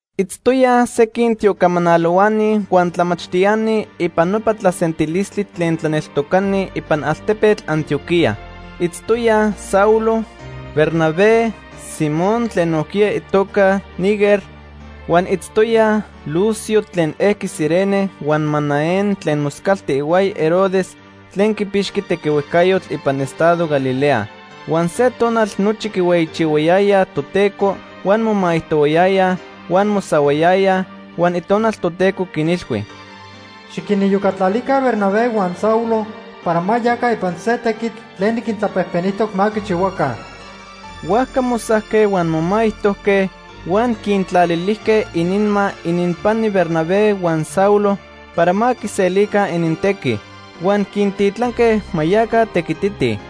Itztoyaj sequin tiocamanalohuani huan tlamachtiani ipan nopa tlasentilistli tlen tlaneltocani ipan altepetl Antioquía. Itztoyaj Saulo, Bernabé, Simón tlen nojquiya itoca Niger, huan itztoyaj Lucio tlen ejqui Cirene huan Manaén tlen moscalti ihuaya Herodes tlen quipixqui tequihuejcayotl ipan estado Galilea. Huan se tonal nochi quihueyichihuayayaj Toteco huan momaijtohuayayaj, huan mosahuayayaj, huan Itonal Toteco quinilhui: “Xiquiniyocatlalica Bernabé huan Saulo para ma yaca ipan se tequitl tlen niquintlapejpenijtoc ma quichihuaca.” Huajca mosajque huan momaijtojque, huan quintlalilijque ininma ininpani Bernabé huan Saulo para ma quiselica inintequi. Huan quintitlanque ma yaca tequititij.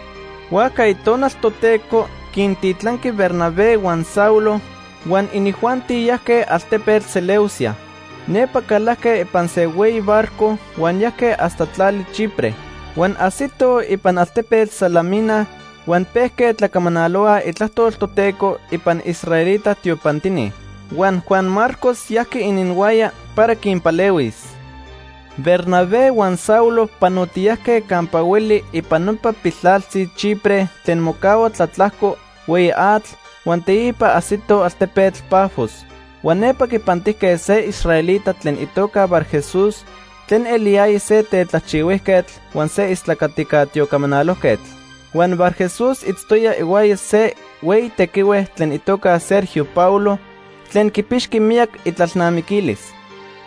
Huajca Itonal Toteco quintitlanqui Bernabé huan Saulo huan inijuanti yajque altepetl Seleucia. Nepa calajque ipan se hueyi barco huan yajque hasta tlali Chipre. Huan ajsitoj ipan altepetl Salamina huan pejque tlacamanalohuaj itlajtol Toteco ipan israelita tiopantini. Huan Juan Marcos yajqui ininhuaya para quinpalehuis. Bernabé huan Saulo panotiyajque campa hueli ipan nopa piltlaltzi Chipre tlen mocahua tlatlajco hueyi atl huan teipa ajsitoj altepetl Pafos. Huan nepa quipantijque se israelita tlen itoca Barjesús tlen eliyaya se tetlajchihuijquetl huan se istlacatica tiocamanalojquetl. Huan Barjesús itztoya ihuaya se hueyi tequihue tlen itoca Sergio Paulo, tlen quipixqui miyac itlalnamiquilis.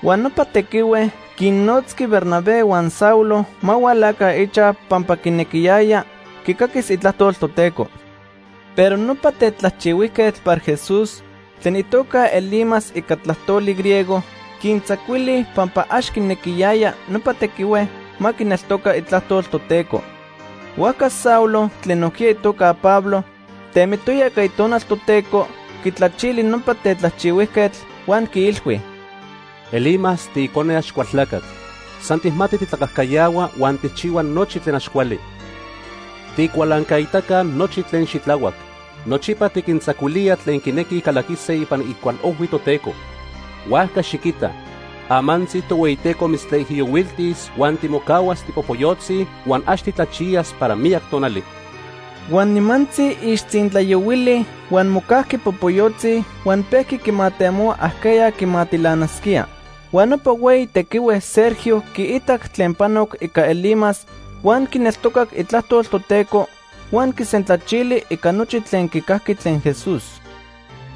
Huan nopa tequihue quinnotzqui Bernabé huan Saulo ma hualaca ichaj pampa quinequiyaya quicaquis itlajtol Toteco. Pero nopa tetlajchihuijquetl Barjesús, tlen itoca Elimas ica tlajtoli griego, quintzacuili pampa ax quinequiyaya nopa tequihue ma quineltoca itlajtol Toteco. Huajca Saulo, tlen nojquiya itoca Pablo, temitoya ica Itonal Toteco, quitlachili nopa tetlajchihuijquetl, huan quiilhui: ―Elimas, tiicone Axcualtlacatl. San tijmati titlacajcayahua huan tijchihua nochi tlen ax cuali. Tiicualancaitaca nochi tlen xitlahuac. Nochipa tiquintzacuilía tlen quinequij calaquise ipan icualojhui Toteco. Huajca xiquita, amantzi Tohueyiteco mitztlaijiyohuiltis huan timocahuas tipopoyotzi huan ax titlachiyas para miyac tonali. Huan nimantzi ixtzintlayohuili huan mocajqui popoyotzi huan pejqui quimatemohua ajqueya quimatilanasquía. Huan nopa hueyi tequihue Sergio quiitac tlen panoc ica Elimas, huan quineltocac itlajtol Toteco huan quisentlachili ica nochi tlen quicajqui tlen Jesús.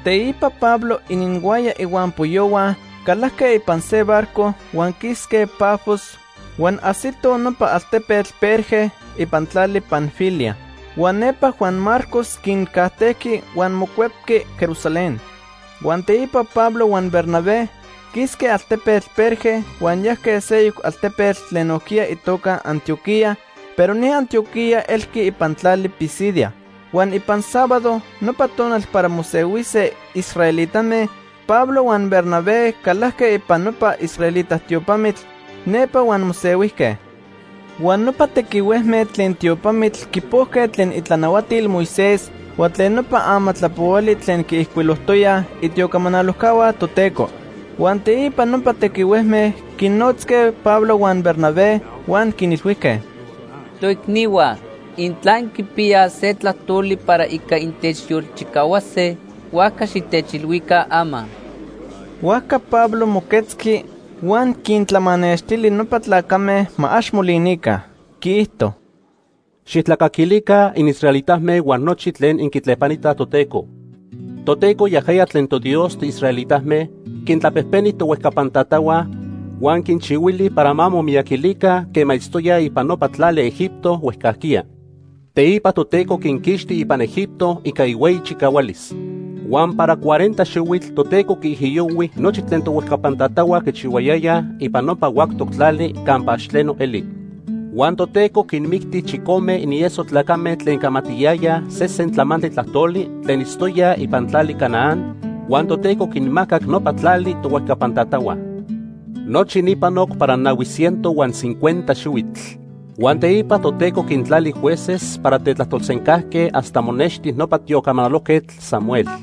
Teipa Pablo ininhuaya ihuampoyohua calajque ipan se barco huan quisque Pafos huan ajsitoj nopa altepetl Perge ipan tlali Panfilia. Huan nepa Juan Marcos quincajtejqui huan mocuepqui Jerusalén. Huan teipa Pablo huan Bernabé quisque altepetl Perge huan yajque seyoc altepetl tlen nojquiya itoca Antioquía, pero ni Antioquía elqui ipan tlali Pisidia. Huan ipan sábado, nopa tonal para mosehuise israelitame, Pablo huan Bernabé calajque ipan nopa israelita tiopamitl nepa huan mosehuijque. Huan nopa tequihuejme tlen tiopamitl quipojque tlen itlanahuatil Moisés huan tlen nopa amatlapohuali tlen quiijcuilojtoyaj itiocamanalojcahua Toteco. Huan teipa nopa tequihuejme quinnotzque Pablo huan Bernabé huan quinilhuijque: ―Toicnihua, intla inquipiyaj se tlajtoli para ica intechyolchicahuase, huajca xitechilhuica ama. Huajca Pablo moquetzqui huan quintlamanextili nopa tlacame ma ax molinica. Quiijto: ―Xijtlacaquilica inisraelitame huan nochi tlen inquitlepanitaj Toteco. Toteco, yajaya tlen toDios tiisraelitame, quintlapejpeni tohuejcapan tatahua, huan quinchihuili para ma momiyaquilica quema itztoyaj ipan nopa tlali Egipto huejcajquiya. Teipa Toteco quinquixti ipan Egipto ica ihueyi chicahualis. Huan para cuarenta xihuitl Toteco quiijiyohui nochi tlen tohuejcapan tatahua quichihuayayaj ipan nopa huactoc tlali campa ax tleno eli. Huan Toteco quinmicti chicome inieso tlacame tlen camatiyayaj sesen tlamantli tlajtoli tlen itztoyaj ipan tlali Canaán, huan Toteco quinmacac nopa tlali tohuejcapan tatahua. Nochi ni panoc para nahui ciento huan cincuenta xihuitl. “Huan teipa Toteco quintlali jueces para tetlajtolsencajque hasta monexti nopa tiocamanalojquetl Samuel.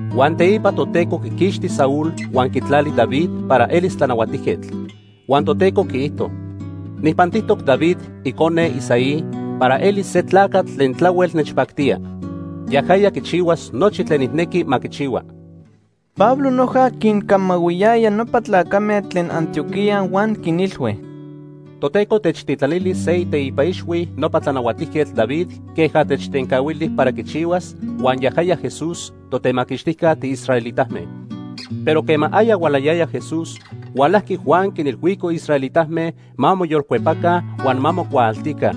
Huan teipa Toteco quiquixti Saúl huan quitlali David para elis tlanahuatijquetl. Huan Toteco quiijto: ‘Nijpantijtoc David, icone Isaí, para eli se tlacatl tlen tlahuel nechpactía. Yajaya quichihuas nochi tlen nijnequi ma quichihua.’” Pablo noja quincamahuiyaya nopa tlacame tlen Antioquía huan quinilhui: ―Toteco techtitlanili se iteipa ixhui nopa Tlanahuatijquetl David queja techtencahuili para quichihuas, huan yajaya Jesús, Totemaquixtijca tiisraelitame. Pero quema aya hualayaya Jesús, hualajqui Juan quinilhuico israelitame ma moyolcuepaca huan ma mocuaaltica.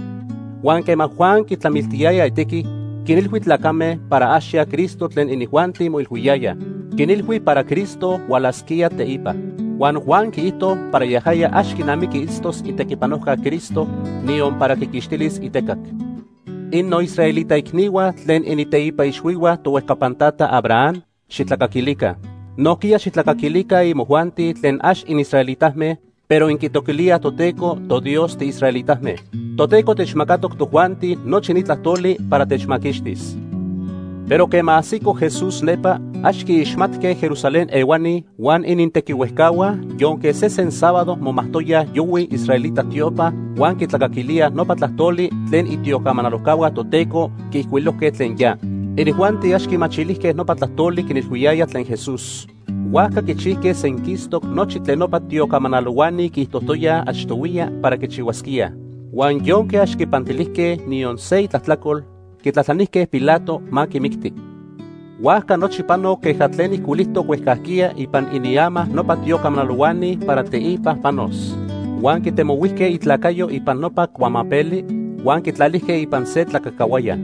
Huan quema Juan quitlamiltiyaya itequi, quinilhui tlacame para ax ya Cristo tlen inijuanti moilhuiyayaj. Quinilhui para Cristo hualasquía teipa. Huan Juan quiijto para yajaya ax quinamiqui itztos itlatequipanojca Cristo, niyon para quiquixtilis itecac. “Innoisraelita icnihua tlen initeipa ixhuihua tohuejcapan tata Abraham, xijtlacaquilica. Nojquiya xijtlacaquilica imojuanti tlen ax inisraelitame, pero inquitoquilíaj Toteco, toDios tiisraelitame. Toteco techmacatoc tojuanti nochi ni tlajtoli para techmaquixtis. Pero quema ajsico Jesús nepa, ax quiixmatque Jerusalén ehuani huan inintequihuejcahua, yonque sesen sábado momajtoyaj yohui israelita tiopa huan quitlacaquilíaj nopa tlajtoli tlen itiocamanalojcahua Toteco quiijcuilojque tlen ya. Inijuanti ax quimachilijque nopa tlajtoli quinilhuiyaya tlen Jesús. Huajca quichijque senquistoc nochi tlen nopa tiocamanalohuani quiijtojtoyaj achtohuiya para quichihuasquíaj. Huan yonque ax quipantilijque niyon se itlajtlacol, quitlajtlanijque Pilato ma quimicti. Huajca nochi panoc queja tlen ijcuilijtoc huejcajquiya ipan iniama nopa tiocamanalohuani para teipa panos. Huan quitemohuijque itlacayo ipan nopa cuamapeli, huan quitlalijque ipan se tlacacahuaya.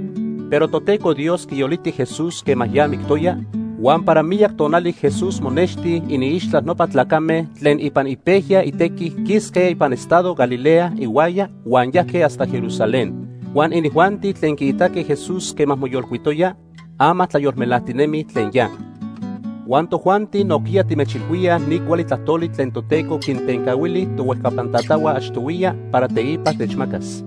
Pero Toteco Dios quiyoliti Jesús quema ya mictoya, huan para miyac tonali Jesús monexti iniixtla nopa tlacame tlen ipan ipejya itequi quisque ipan estado Galilea ihuaya huan yajque hasta Jerusalén. Huan inijuanti tlen quiitaque Jesús quema moyolcuitoya, ama tlayolmelajtinemij tlen ya. “Huan tojuanti nojquiya timechilhuíaj ni cuali tlajtoli tlen Toteco quintencahuili tohuejcapan tatahua achtohuiya para teipa techmacas.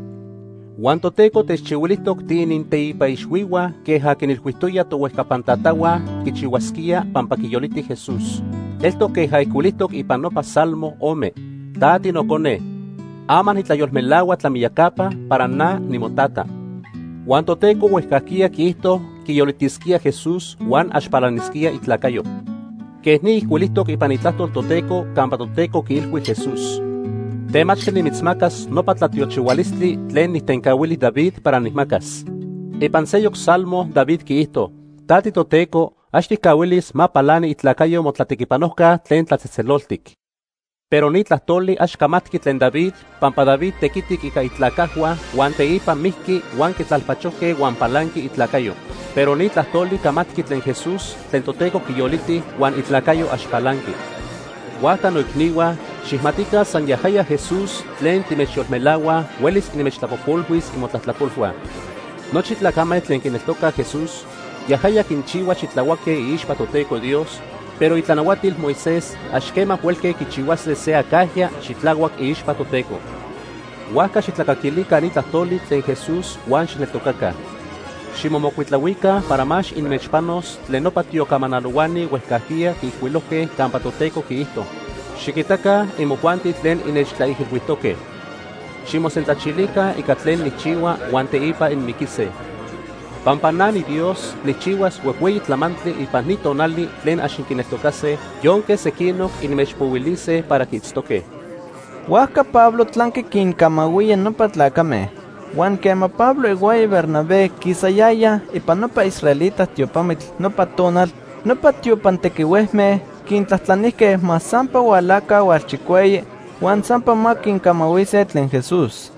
Huan Toteco techchihuilijtoc tiininteipa ixhuihua queja quinilhuijtoya tohuejcapan tatahua quichihuasquía pampa quiyoliti Jesús. Eltoc queja ijcuilijtoc ipan nopa Salmo ome: ‘Ta tiNocone. Ama nitlayolmelahua tlamiyacapa para na nimoTata.’ Huan Toteco huejcajquiya quiijto quiyolitisquíaj Jesús huan ax palanisquía itlacayo. Quej ni ijcuilijtoc ipan Itlajtol Toteco campa Toteco quiilhui Jesús: ‘Temachtli nimitzmacas nopa tlatiochihualistli tlen nijtencahuili David para nijmacas.’ Ipan seyoc Salmo David quiijto: ‘Ta tiToteco, ax tijcahuilis ma palani itlacayo Motlatequipanojca Tlen Tlatzejtzeloltic.’ “Pero ni tlajtoli ax camatqui tlen David pampa David tequitic ica itlacajhua huan teipa mijqui huan quitlalpachojque huan palanqui itlacayo. Pero ni tlajtoli camatqui tlen Jesús tlen Toteco quiyoliti huan itlacayo ax palanqui. Huajca noicnihua, xijmatica san yajaya Jesús tlen timechyolmelahuaj huelis inmechtlapojpolhuis imotlajtlacolhua. Nochi tlacame tlen quineltocaj Jesús, yajaya quinchihua xitlahuaque iixpa Toteco Dios, pero itlanahuatil Moisés ax quema huelque quichihuase se acajya xitlahuac iixpa Toteco. Huajca xijtlacaquilica ni tlajtoli tlen Jesús huan xijneltocaca. Ximomocuitlahuica para ma ax inmechpanos tlen nopa tiocamanalohuani huejcajquiya quiijcuilojque campa Toteco quiijto: ‘Xiquitaca, imojuanti tlen innechtlaijilhuijtoque. Ximosentlachilica ica tlen nijchihua huan teipa inmiquise. Pampa na niDios nijchihuas huejhueyi tlamantli ipan ni tonali tlen ax inquineltocase yonque sequinoc inmechpohuilise para quiitztoque.’” Huajca Pablo tlanqui quincamahuía nopa tlacame. Huan quema Pablo ihuaya Bernabé quisayayaj ipan nopa israelita tiopamitl nopa tonal, nopa tiopan tequihuejme quintlajtlanijque ma sampa hualaca hualchicueyi huan sampa ma quincamahuise tlen Jesús.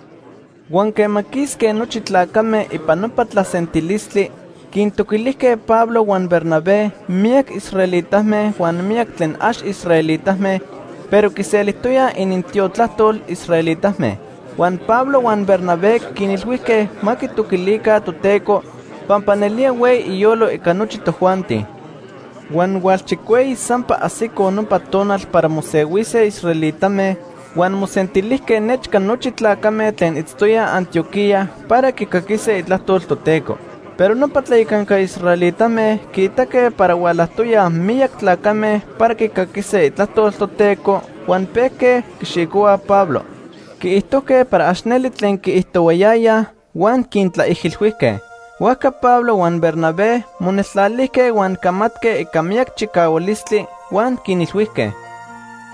Huan quema quisque nochi tlacame ipan nopa tlasentilistli, quintoquilijque Pablo huan Bernabé miyac israelitame huan miyac tlen ax israelitame pero quiselijtoyaj inintiotlajtol israelitame. Huan Pablo huan Bernabé quinilhuijque ma quitoquilica Toteco pampa nelía hueyi iyolo ica nochi tojuanti. Huan hualchicueyi sampa ajsico nopa tonal para mosehuise israelitame, huan mosentilijque nechca nochi tlacame tlen itztoyaj Antioquía para quicaquise itlajtol Toteco. Pero nopa tlayacanca israelitame quiitaque para hualajtoyaj miyac tlacame para quicaquise itlajtol Toteco huan pejque quixicohuaj Pablo. Quiijtojque para ax neli tlen quiijtohuayayaj huan quintlaijilhuijque. Huajca Pablo huan Bernabé moneltlalijque huan camatque ica miyac chicahualistli huan quinilhuijque: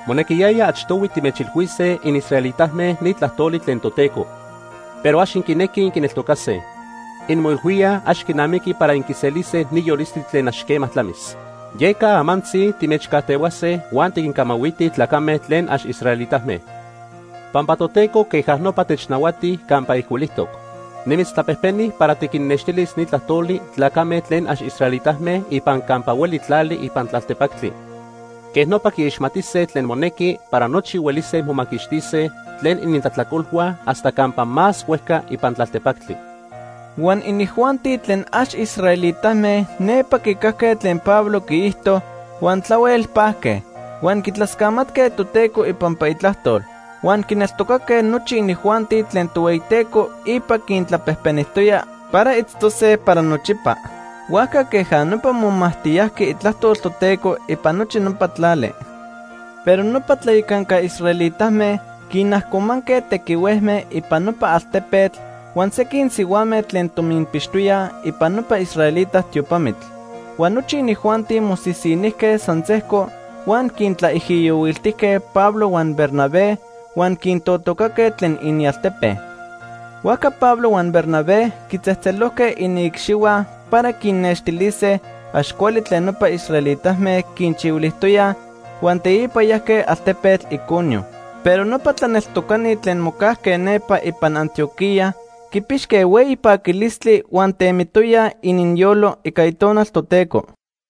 ―Monequiyaya achtohui timechilhuise inisraelitame ni tlajtoli tlen Toteco. Pero ax inquinequij inquineltocase. Inmoilhuíaj ax quinamiqui para inquiselise ni yolistli tlen ax quema tlamis. Yeca amantzi timechcajtehuase huan tiquincamahuitij tlacame tlen ax israelitame, pampa Toteco queja nopa technahuati campa ijcuilijtoc: ‘Nimitztlapejpeni para tiquinnextilis ni tlajtoli tlacame tlen ax israelitame ipan campa hueli tlali ipan tlaltepactli. Quej nopa quiixmatise tlen monequi para nochi huelise momaquixtise tlen inintlajtlacolhua hasta campa más huejca ipan tlaltepactli.’ Huan inijuanti tlen ax israelitame nepa quicajque tlen Pablo quiijto, huan tlahuel pajque. Huan quitlascamatque Toteco ipampa itlajtol. Huan quineltocaque nochi inijuanti tlen Tohueyiteco ipa quintlapejpenijtoya para itztose para nochipa. Huajca queja nopa momajtiyajqui itlajtol Toteco ipan nochi nopa tlali. Pero nopa tlayacanca israelitame quinajcomanque tequihuejme ipan nopa altepetl huan sequin sihuame tlen tominpixtoyaj ipan nopa israelita tiopamitl. Huan nochi inijuanti mosisinijque san sejco huan quintlaijiyohuiltijque Pablo huan Bernabé huan quintotocaque tlen inialtepe. Huajca Pablo huan Bernabé quitzejtzelojque iniicxihua para quinnextilise ax cuali tlen nopa israelitame quinchihuilijtoyaj huan teipa yajque altepetl Iconio. Pero nopa tlaneltocani tlen mocajque nepa ipan Antioquía quipixque hueyi paquilistli huan temitoyaj ininyolo ica Itonal Toteco.